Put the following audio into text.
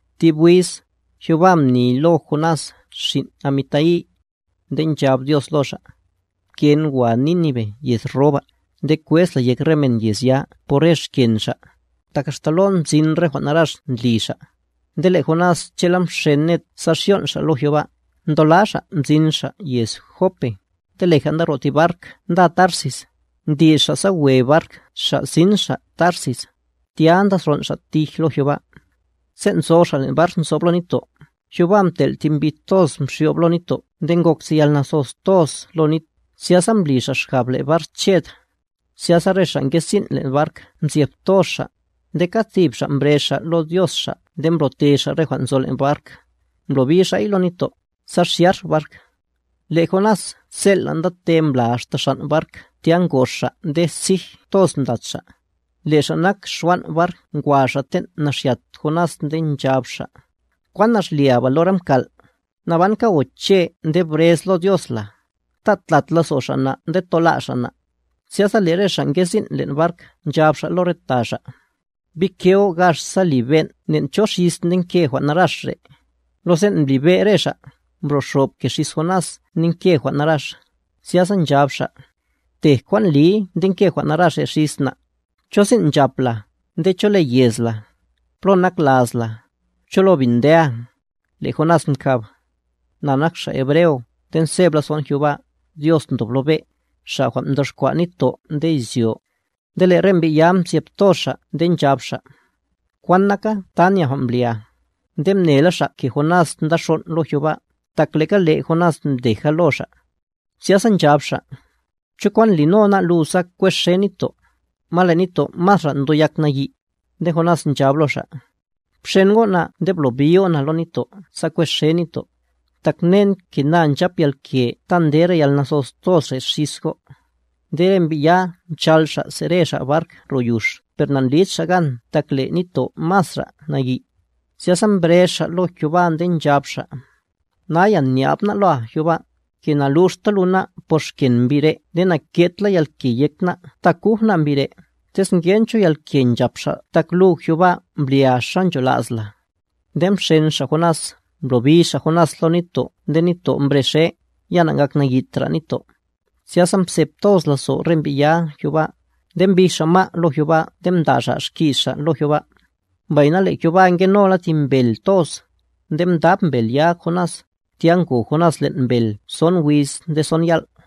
Thib wiz, Jehová mni lo Jonás xin' Amitai, nde nchab Dios lo xa': —Pken wa Nínive yez ro ba, nde kwez la yek re men yez ya por re xken xa', tak axta lon mzin re jwan' narax ndli xa'. Nde le' Jonás che'la mxen ned sa xyon' xa' lo Jehová, mdola xa' mzin xa' yez Jope, nde leja nda ro' ti bark nda Tarsis, mdi'x xa' sa we bark xa' sin xa' Tarsis, tya nda xon' xa' tij lo Jehová. Sen' nzo xa' len' bark nzob lo nitto', Jehová mtel' thi mbi toz mxyo'b lo nitto' nde ngok ti yalnathos toz lo nit, zyasa mbli xa' xgab le' bark ched. Zyasa re xa' nge sin' len' bark mzyeb toz xa', nde kad tib xa' mbrez xa' lo dios xa' nde mblo'te xa' re jwan' nzo len' bark, mblobi xa'y lo nitto', sa xyax bark. Le' Jonás zel'la' ndate mbla axta xan' bark tya ngox xa' nde sij toz mdat xa'. Le' xa' nak xwan' bark ngwa xa' ten' naxyat Jonás nde nchab xa': —¿Kwan nax lia ba lora mkal'? ¡Nabanka goche' nde brez lo Dios la! Ta' tlat lazo' xa' na' nde tola' xa' na'. Zyasa le' re xa' nge sin' len' bark nchab xa' lo re ta xa': —Bike go' gax sa liben' nen' cho xis ndenke jwan' narax re'. Lo sen' mblibe' re xa', mbro' xob ke xis Jonás ndenke jwan' narax. Zyasa nchab xa': —Btej kwan ndliy ndenke jwan' narax re' xis na'. ¿Cho sin' nchap la, nde cho le yez la? ¿Plo nak laz la? ¿Cho lo bin ndea? Le' Jonás mkab: —Na nak xa' Hebreo, nde nzeb lazo'n Jehová, Dios ndob lo be', Xa' jwan' mdoxkwa' nitto' nde izyo. Nde le' re mbi' ya mzyeb toz xa' nde nchab xa': —¿Kwan naka ta nya jwan' mblia? Nde mnela xa' ke Jonás nda xon' lo Jehová, tak le'ga le' Jonás mdeja lo xa'. Zyasa nchab xa': —¿Cho kwan lino ná' lu sa kwexe nitto'? Ma le' nitto' masra ndo yak nayi'. Nde Jonás nchab lo xa': —Bxen go' na nde blobi go' na lo nitto' sa kwexe nitto'. Tak mnen ke na nchap yalke ta nde yalnathos toz re' xis go'. Nde re mbi' ya mchal xa' se're xa' bark ro yux per nandlid xa' gan tak le' nitto' masra' nayi'. Zyasa mbrez xa' lo Jehová nde nchab xa': —Naya nya'b ná' loa Jehová, ke na'luxta lu ná' por xken mbi' re' nde na'ke'd la yalke yek ná' ta kuj ná' mbi' re', tez ngen cho yalke nchap xa' tak lu Jehová mblia xa ncholas la. Nde mxen xa' Jonás, mblobi xa' Jonás lo nitto' nde nitto' mbrexe, ya na'ngaknayitra nitto'. Zyasa mzeb toz lazo' re mbi' ya' Jehová, nde mbij xa' ma' lo Jehová nde mda' xa' xki's xa' lo Jehová. Mbayna le' Jehová ngenola ti mbel toz, nde mdab mbel ya Jonás, tya ngo Jonás len' mbel son wiz nde son yal'.